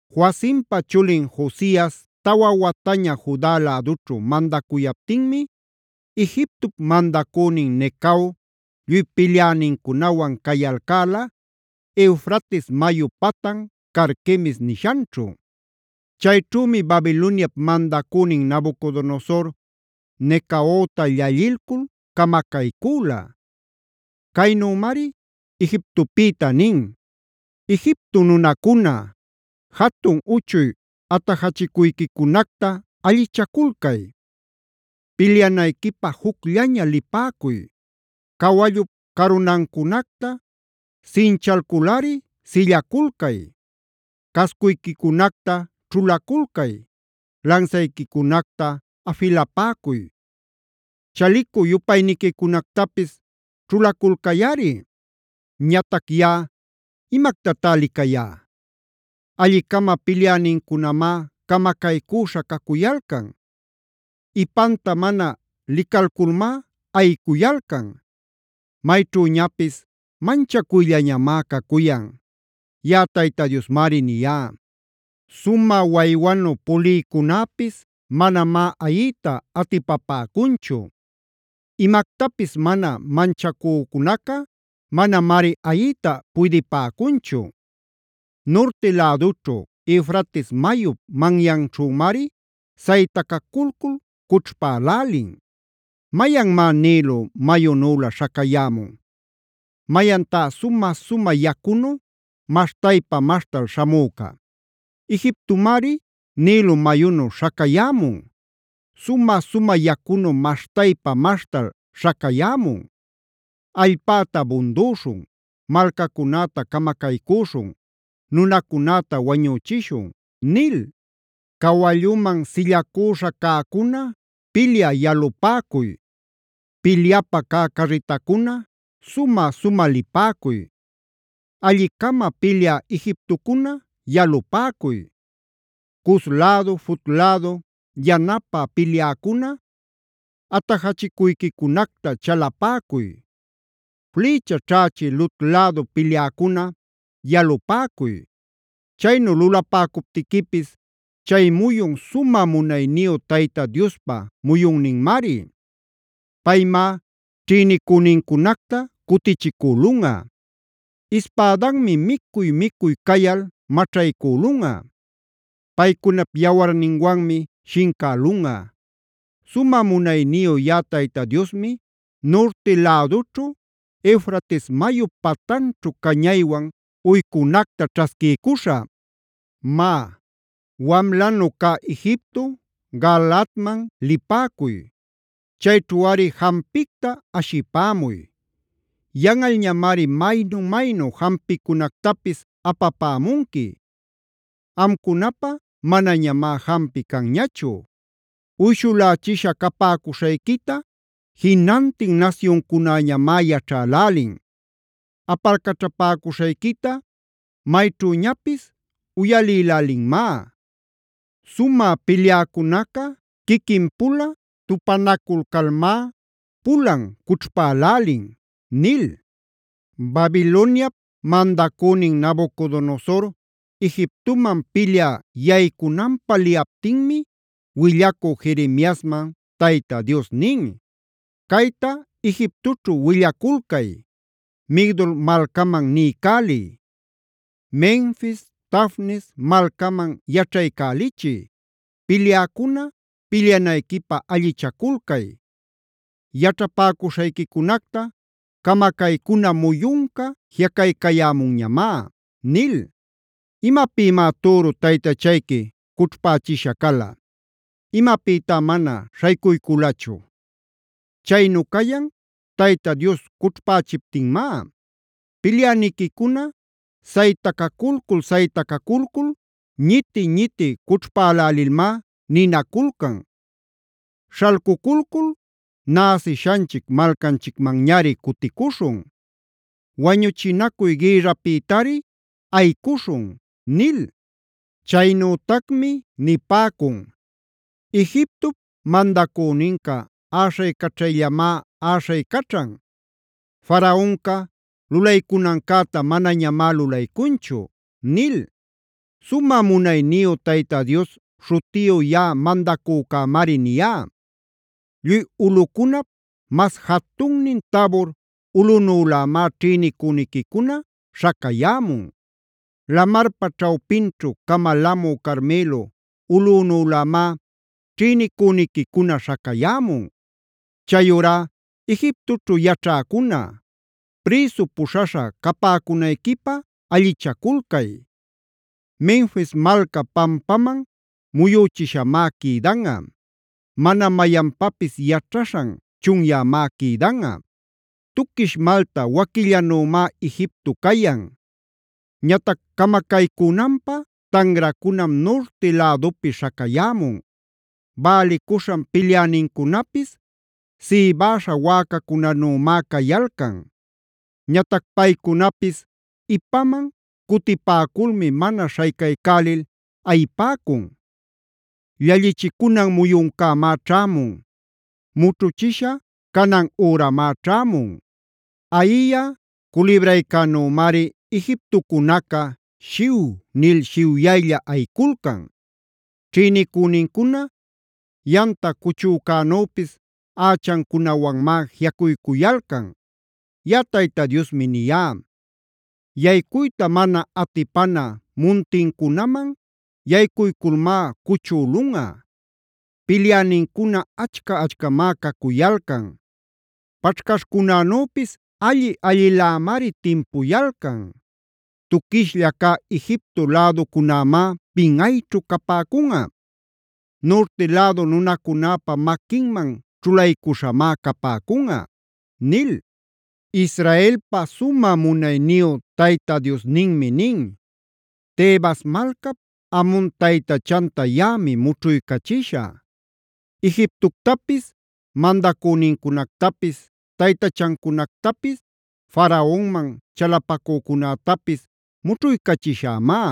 Joacimpa chulin Josias tawa wataña Juda lädućhu mandacuyaptinmi, Egiptopa mandacünin Necao lluy pilyänincunawan cayalcäla Eufrates mayu patan Carquemis nishanćhu. Chayćhümi Babiloniap mandacünin Nabucodonosor, Necaota llallilcul camacaycüla. Caynümari Egiptopïta nin: “Egipto nunacuna, jatun-uchuy atajachicuyquicunacta allichaculcay; pilyanayquipä jucllaña lipäcuy. Cawallup carunancunacta sinchalculꞌari sillaculcay. Cascuyquicunacta ćhulaculcay, lansayquicunacta afilapäcuy, chalicu-yupayniquicunactapis ćhulaculcayꞌari. Ñatac yaꞌa ¿imactatá licayá? Alli-cama pilyänincunamá camacaycüśha cacuyalcan; ipanta mana licalculmá ayicuyalcan. Mayćhüñapis manchacuyllañamá cacuyan.b Yaꞌa Tayta Diosmari niyá. Sumä waywanu pulïcunäpis manamá ayiyta atipapäcunchu. Imactapis mana manchäcunaca manamari ayiyta puydïpäcunchu. Nurti lädućhu, Eufrates mayup manyanćhümari saytacaculcul cućhpälälin. “¿Mayanmá Nilo mayunülä śhacayämun? ¿Mayantá sumä-sumä yacunu maśhtaypa-maśhtal śhamüca? Egiptomari Nilo mayunu śhacayämun; sumä-sumä yacunu maśhtaypa-maśhtal śhacayämun: ‘Allpäta bundüśhun, malcacunäta camacaycüśhun, nunacunäta wañüchishun’ nil. “Cawalluman sillacüśha cäcuna, pilyä yalupäcuy. Pilyapä cä carritacuna, sumä-sumä lipäcuy. Alli-cama pilyä Egiptocuna, yalupäcuy. Cus lädu, Fut lädu yanapä pilyäcuna, atajachicuyquicunacta chalapäcuy. Flïcha ćhächï Lud lädu pilyäcuna, yalupäcuy. Chaynu lulapäcuptiquipis chay muyun sumä munayniyu Tayta Diospa muyunninmari. Paymá ćhïnicünincunacta cutichicülunꞌa. Ispädanmi micuy-micuy cayal maćhaycülunꞌa; paycunap yawarninwanmi shincälunꞌa. Sumä munayniyu yaꞌa Tayta Diosmi nurti lädućhu, Eufrates mayup patanćhu cañaywan uycunacta ćhasquiycuśhä. “Má, wamlanu cä Egipto, Galaadman lipäcuy; chayćhuꞌari jampicta ashipämuy. Yanꞌalñamari maynu-maynu jampicunactapis apapämunqui; amcunapä manañamá jampi canñachu. Uyshulächisha capäcuśhayquita jinantin nasyuncunäñamá yaćhälälin. Apalcaćhapäcuśhayquita mayćhüñapis uyalïlälinmá. Sumä pilyäcunaca quiquin-pula tupanaculcalmá, pulan cućhpälälin” nil. Babiloniap mandacünin Nabucodonosor Egiptoman pilyä yaycunanpä liyaptinmi willacü Jeremiasman Tayta Dios nin:c “Cayta Egiptoćhu willaculcay; Migdol malcaman niycäliy. Menfis, Tafnes malcaman yaćhaycälichiy: ‘Pilyäcuna, pilyanayquipä allichaculcay; yaćhapäcuśhayquicunacta camacaycuna muyunca jiꞌacaycayämunñamá’ nil. ¿Imapïmá türu taytachayqui cućhpächisha cala? ¿Imapïtá mana śhaycuyculachu? Chaynu cayan, Tayta Dios cućhpächiptinmá. Pilyäniquicuna saytacaculcul-saytacaculcul ñiti-ñiti cućhpälälilmá ninaculcan: ‘Śhalcuculcul, näsishanchic malcanchicmanñari cuticuśhun. Wañuchinacuy gïrrapïtari ayicuśhun’ nil. Chaynütacmi nipäcun: ‘Egiptop mandacüninca äśhaycaćhayllamá äśhaycaćhan; Faraonca lulaycunancäta manañamá lulaycunchu’ nil. “Sumä munayniyu Tayta Dios śhutiyu yaꞌa mandacücämari niyá: Lluy ulꞌucunap mas jatunnin Tabor ulꞌunülämá ćhïnicüniquicuna śhacayämun. Lamarpa ćhawpinćhu camalamü Carmelo ulꞌunülämá ćhïnicüniquicuna śhacayämun. Chayurá Egiptoćhu yaćhäcuna, prïsu puśhaśha capäcunayquipä allichaculcay. Menfis malca pampaman muyüchishamá quïdanꞌa; mana mayanpapis yaćhaśhan chunyämá quïdanꞌa. “Tuquish malta waquillanümá Egipto cayan. Ñatac camacaycünanpä tanracunam nurti lädupi śhacayämun. Bälicuśhan pilyänincunapis sïbäśha wäcacunänümá cayalcan. Ñatac paycunapis ipaman cutipäculmi mana śhaycaycälil ayipäcun. Llallichicunan muyuncämá ćhämun; mućhuchisha canan üramá ćhämun. “Ayiyä culibraycänümari Egiptocunaca shiw nil shiwyaylla ayiculcan. Ćhïnicünincuna yamta cuchücänüpis ächancunawanmá jiꞌacuycuyalcan. Yaꞌa Tayta Diosmi niyá: Yaycuyta mana atipana muntincunaman yaycuyculmá cuchülunꞌa. Pilyänincuna achca-achcamá cacuyalcan; paćhcaśhcunänüpis alli-allilämari timpuyalcan. Tuquishlla cä Egipto läducunämá pinꞌayćhu capäcunꞌa; nurti lädu nunacunäpä maquinman ćhulaycuśhamá capäcunꞌa” nil. Israelpa sumä munayniyu Tayta Diosninmi nin: “Tebas malcap Amon taytachanta yaꞌami mućhuycachishä; Egiptoctapis, mandacünincunactapis, taytachancunactapis Faraonman chalapacücunätapis mućhuycachishämá.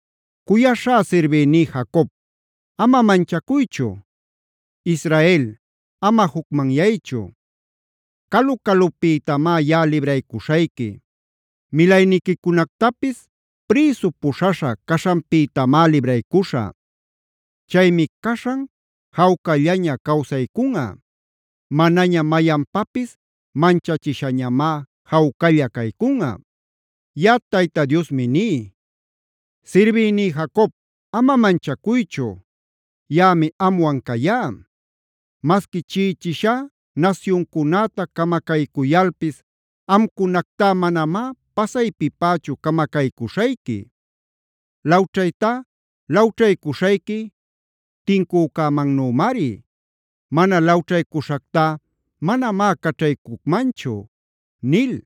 “Cuyaśhá sirbïní Jacob, ama manchacuychu; Israel, ama jucmanyaychu. Calu-calupïtamá yaꞌa libraycuśhayqui. Milayniquicunactapis prïsu puśhaśha caśhanpïtamá libraycuśhä. Chaymi caśhan jawcallaña cawsaycunꞌa. Manaña mayanpapis manchachishañamá jawcalla caycunꞌa. Yaꞌa Tayta Diosmi ní: Sirbïní Jacob, ama manchacuychu; yaꞌami amwan cayá. Masqui chiꞌichishá nasyuncunäta camacaycuyalpis amcunactá manamá pasaypipächu camacaycuśhayqui. Lawćhaytá lawćhaycuśhayqui tincücämannümari. Mana lawćhaycuśhactá manamá caćhaycucmanchu” nil.